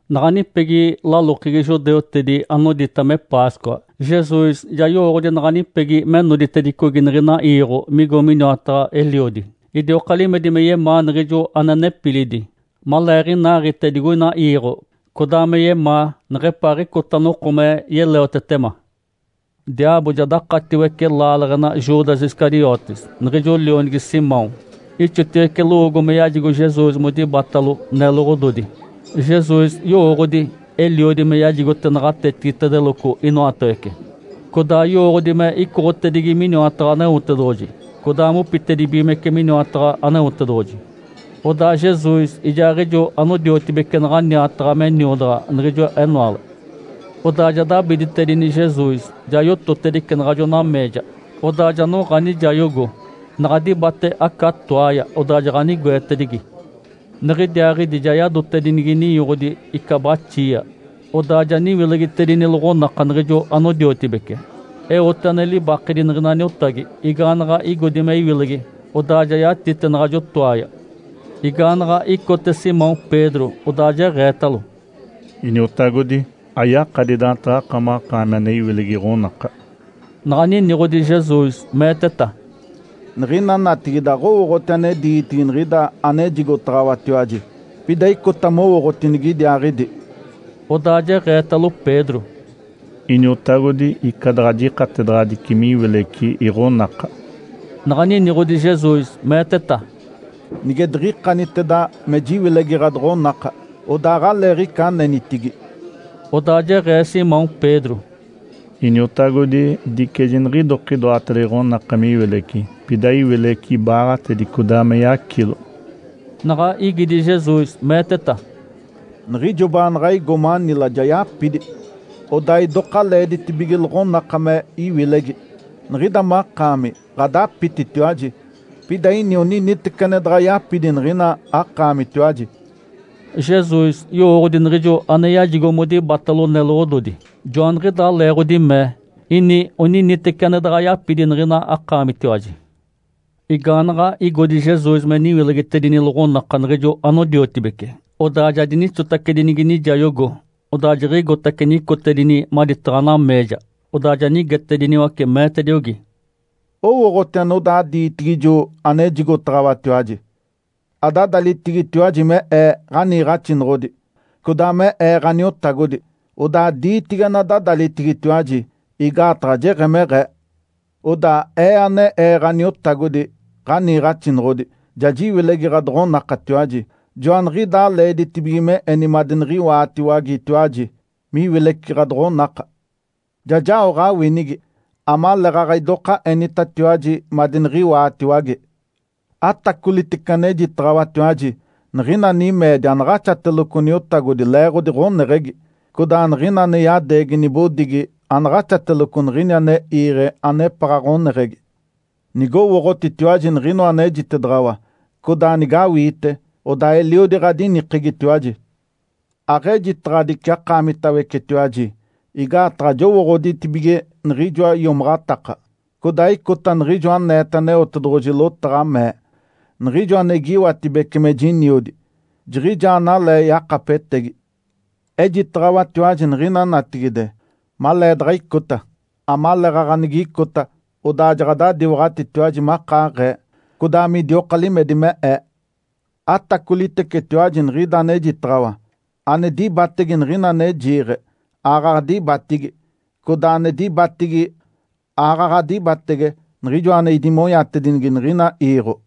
Naɡ̶a nipegi lalokegi judeutedi anodita me Páscoa. Jesus ja yowooɡ̶odi naɡ̶anipegi me noditedicogi niɡ̶ina iiɡ̶o migo miniwataɡ̶a Eliodi. Idioka limedi me yemaa niɡ̶ijo ane nepilidi, maleeɡ̶inaaɡ̶ite digoina iiɡ̶o, codaa me yemaa neɡ̶epaaɡ̶icota noko me yeleotetema. Diaabo ja dakatiwece laaleɡ̶ena Judas Iscariotes, niɡ̶ijo lionigi Simão, ixotiwece lowoogo me yajigo Jesus modibatalo neloɡ̶ododi. Jesus yowooɡ̶odi Eliodi me yajigote naɡ̶atetigitedeloco inoatawece. Codaa yowooɡ̶odi me icoɡ̶otedigi miniwataɡ̶a Aneotedoɡ̶oji codaa mopitedibigimece miniwataɡ̶a Aneotedoɡ̶oji. Odaa Jesus ijaaɡ̶ijo anodiotibece naɡ̶a niataɡ̶a me niodaɡ̶a niɡ̶ijo enoale. Odaa ja dabiditedini Jesus, ja yototedice naɡ̶ajo nameeja, odaa ja noɡ̶a nijayogo. Naɡ̶a dibate aca toaaya, odaa jaɡ̶anigoetedigi. Niɡ̶idiaaɡ̶idi ja yadotedinigi ninyoɡ̶odi ica baxia. Odaa ja niwilegitedini loɡ̶onaka niɡ̶ijo anodiotibece, eote ane libakedi niɡ̶ina niotagi. Igaanaɡ̶a igodi me iwilegi, odaa ja yatite naɡ̶ajo toaaya. Igaanaɡ̶a icote Simão Pedro, odaa jeɡ̶eetalo, “Iniotagodi. Ayakadi daantaɡ̶akamaɡ̶akaami ane iwilegi iɡ̶onaka.” Naɡ̶a niniɡ̶odi Jesus, meeteta, “Niɡ̶ina natigide aɡ̶owooɡ̶oti ane diitigi niɡ̶ida anejigotaɡ̶awatiwaji. Pida icota mowooɡ̶oti nigidiaaɡ̶idi”. Odaa jeɡ̶eetalo Pedro, “Iniotagodi. Ica daɡ̶a jikatedaɡ̶adici me iwileci iɡ̶onaka”. Naɡ̶a niniɡ̶odi Jesus, meeteta, “Nige diɡ̶ikaniteda me jiwilegi ɡ̶adoɡ̶onaka, odaa aɡ̶aleeɡ̶ica anenitigi”. Odaa jeɡ̶ee Simão Pedro, “Iniotagodi, dice jiniɡ̶idokidoateda iɡ̶onaka me iwileci, pida iwileci ibaaɡ̶atedi, codaa me yacilo!” Naɡ̶a igidi Jesus, meeteta, “Niɡ̶ijo baanaɡ̶a igo mánila ja yapidi, odaa idoka leeditibige loɡ̶onaka me iwilegi. Niɡ̶ida makaami ɡ̶adapititiwaji, pida ini oniniteci ane daɡ̶a yapidi niɡ̶ina akaamitiwaji”. Jesus yowooɡ̶odi niɡ̶ijo ane yajigo modibatalo neloɡ̶ododi. Joaniɡ̶idaa leeɡ̶odi mee, “Ini oniniteci ane daɡ̶a yapidi niɡ̶ina akaamitiwaji.” Igaanaɡ̶a igodi Jesus me niwilegitedini loɡ̶onaka niɡ̶ijo anodiotibece, odaa ja dinixotacedinigi nijayogo. Odaa jiɡ̶igotace nicotedini maditaɡ̶a nameeja. Odaa ja nigetediniwace, meetediogi, “Owooɡ̶oti anodaa diitigi ijo anejigotaɡ̶awatiwaji? Adadalitigitiwaji me Ee, ‘Ǥaniiɡ̶axinoɡ̶odi’, codaa me Ee, ‘Ǥaniotagodi’. Odaa diitigi anadadalitigitiwaji, igaataɡ̶a jeɡ̶emeɡ̶ee. Odaa Ee, ane Ee Ǥaniotagodi, Ǥaniiɡ̶axinoɡ̶odi, ja jiwilegi ɡ̶adoɡ̶onakatiwaji. Joaniɡ̶idaa leeditibige me eni madiniɡ̶iwaatiwagetiwaji miwileci ɡ̶adoɡ̶onaka. Ja jao ɡ̶awinigi, amaleeɡ̶aɡ̶a idoka enitatiwaji madiniɡ̶iwaatiwage. Atacolitece anejitaɡ̶awatiwaji! Niɡ̶ina nimeedi anaɡ̶axateloco niotagodi leeɡ̶odi ɡ̶oneɡ̶egi. Codaa niɡ̶ina ane yadeegi nibodigi anaɡ̶axateloco niɡ̶ini ane iiɡ̶e anepaɡ̶a ɡ̶oneɡ̶egi. Nigowooɡ̶otitiwaji niɡ̶inoa anejitedaɡ̶awa, codaa nigawiite, odaa eliodi ɡ̶adinikegitiwaji. Aɡ̶ejitaɡ̶adici akaamitawecetiwaji. Igaataɡ̶a jowooɡ̶oditibige niɡ̶ijoa iomaɡ̶ataka. Codaa icota niɡ̶ijo aneeta Aneotedoɡ̶oji lotaɡ̶a, mee, ‘Niɡ̶ijo ane igiiwatibece me jiniodi, jiɡ̶ijaa analee yakapetegi’. Ejitaɡ̶awatiwaji niɡ̶ina natigide, maleedaɡ̶a icota, amaleeɡ̶aɡ̶a nigicota, odaa jaɡ̶adadiwaɡ̶atitiwaji makaaɡ̶ee, codaa midioka limedi me Ee. Atacolitecetiwaji niɡ̶ida anejitaɡ̶awa. Ane dibatege niɡ̶ina ane jiiɡ̶e, aaɡ̶aɡ̶a dibatigi. Codaa ane dibatigi, aaɡ̶aɡ̶a dibatege Niɡ̶ijoa ane idimonyatedinigi niɡ̶ina iiɡ̶o”.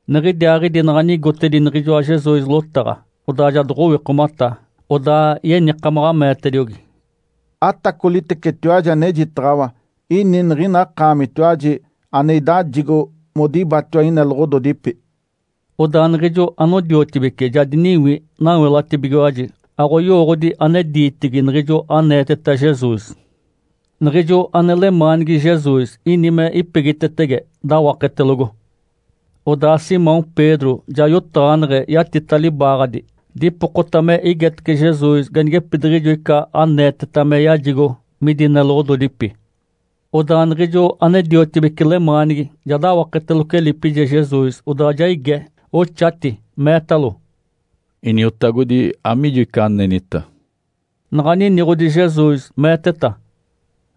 Niɡ̶idiaaɡ̶idi naɡ̶a nigotedi niɡ̶ijoa Jesus lotaɡ̶a, odaa ja doɡ̶owikomata, odaa yenikamaɡ̶a meetediogi, “Atacolitecetiwaji anejitaɡ̶awa. Ini niɡ̶ina akaamitiwaji ane idajigo modibatiwa ineloɡ̶ododipi”. Odaa niɡ̶ijo anodiotibece ja diniwi, nawelatibigiwaji, aɡ̶oyowooɡ̶odi ane diitigi niɡ̶ijo aneeteta Jesus. Niɡ̶ijo ane lemaanigi Jesus ini me ipegitetege, dawaketelogo. Odaa Simão Pedro ja yotaɡ̶aneɡ̶e yatita libaaɡ̶adi, dipokota me igetece Jesus ganigepitiɡ̶ijo ica aneeteta me yajigo midi neloɡ̶ododipi. Odaa niɡ̶ijo ane-diotibece lemaanigi ja dawaketeloco elipije Jesus, odaa ja ige, oxati meetalo, “Iniotagodi. Amiijo ica anenita?” Naɡ̶a niniɡ̶odi Jesus, meeteta,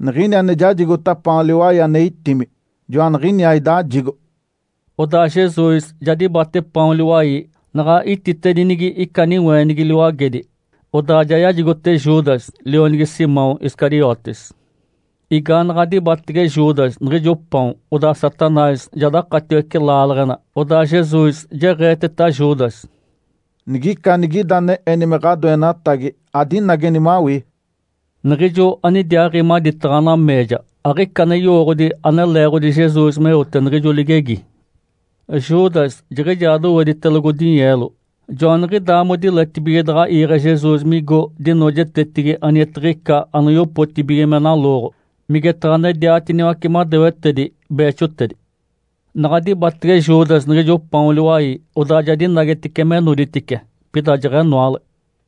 “Niɡ̶ini ane jajigota paon liwai ane itimi, joaniɡ̶iniaa idajigo.” Odaa Jesus ja dibate paon liwai, naɡ̶a ititedinigi ica niweenigi liwagedi, odaa ja yajigote Judas, lionigi Simão Iscariotes. Igaanaɡ̶a dibatege Judas niɡ̶ijo paon, odaa Satanás ja dakatiwece laaleɡ̶ena. Odaa Jesus jeɡ̶eeteta Judas, “Nigica anigida ane eni me ɡ̶adoenatagi, adinageni mawii”. Niɡ̶ijo anidiaaɡ̶i maditaɡ̶a nameeja, aɡ̶ica ane yowooɡ̶odi ane leeɡ̶odi Jesus meote niɡ̶ijo ligegi. Judas jiɡ̶ijaa doweditelogo dinyeelo. Joaniɡ̶idaa modiletibige daɡ̶a iiɡ̶e Jesus migo dinoojetetigi anigetiɡ̶ica anoyopotibige me nalooɡ̶o, migetaɡ̶a nediatiniwace madewetedi beexotedi. Naɡ̶a dibatege Judas niɡ̶ijo paon liwai, odaa ja dinagetice me noditice. Pida jeɡ̶enoale.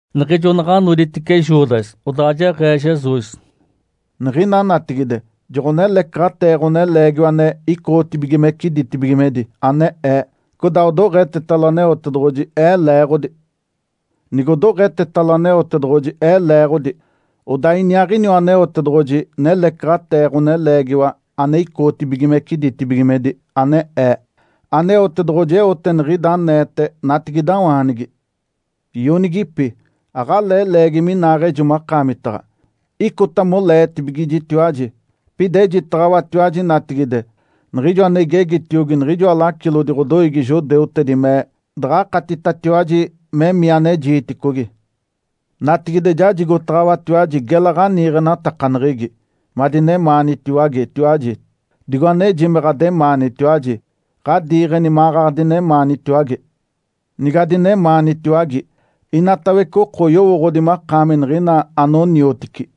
Niɡ̶ijo naɡ̶a noditice Judas, odaa jeɡ̶ee Jesus, “Niɡ̶ina natigide joɡ̶onelecaɡ̶atee Ǥoneleegiwa ane icoɡ̶otibigimece ditibigimedi, ane Ee, codaa odoɡ̶etetalo Aneotedoɡ̶oji Ee leeɡ̶odi. Nigodoɡ̶etetalo Aneotedoɡ̶oji Ee leeɡ̶odi, odaa iniaaɡ̶iniwa Aneotedoɡ̶oji nelecaɡ̶atee Ǥoneleegiwa ane icoɡ̶otibigimece ditibigimedi, ane Ee. Aneotedoɡ̶oji eote niɡ̶ida aneete natigidawaanigi. Ionigipi. Aɡ̶alee leegi minaaɡ̶ejo makaamitaɡ̶a. Icota moleetibigijitiwaji. Pida ejitaɡ̶awatiwaji natigide niɡ̶ijo ane igegitiogi niɡ̶ijoa lacilodi ɡ̶odoiigi judeutedi me daɡ̶akatitatiwaji memii ane jiiticogi. Natigide jajigotaɡ̶awatiwaji gela ɡ̶aniiɡ̶enatakaneɡ̶egi, madinemaanitiwagetiwaji. Digo aneji me ɡ̶ademaanitiwaji, ɡ̶adiiɡ̶eni maɡ̶aɡ̶a adinemaanitiwage. Nigadinemaanitiwage, inatawece oko oyowooɡ̶odi makaami niɡ̶ina anoniotici”.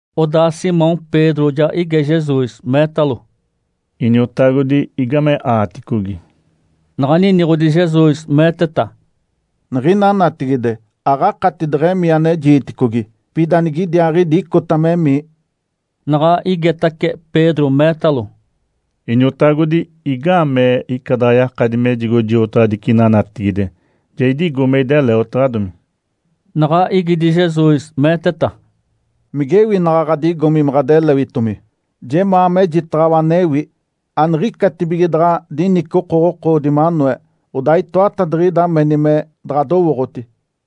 Odaa Simão Pedro ja ige Jesus, meetalo, “Iniotagodi. Igame aaticogi?” Naɡ̶a niniɡ̶odi Jesus, meeteta, “Niɡ̶ina natigide, aɡ̶akati deɡ̶emii ane jiiticogi. Pida nigidiaaɡ̶idi icota memii”. Naɡ̶a igetace Pedro, meetalo, “Iniotagodi. Igaamee ica daɡ̶a jakadi mejigo jiotaɡ̶adici ina natigide? Ja idigo me ideleotaɡ̶adomi”. Naɡ̶a igidi Jesus, meeteta, “Migewi naɡ̶a ɡ̶adigomi me ɡ̶adelewitomi? Jemaa mejitaɡ̶awa anewi. Aniɡ̶icatibige daɡ̶a dinici okoɡ̶okoodi manoe, odaa itoatadiɡ̶ida meni me daɡ̶adowooɡ̶oti”.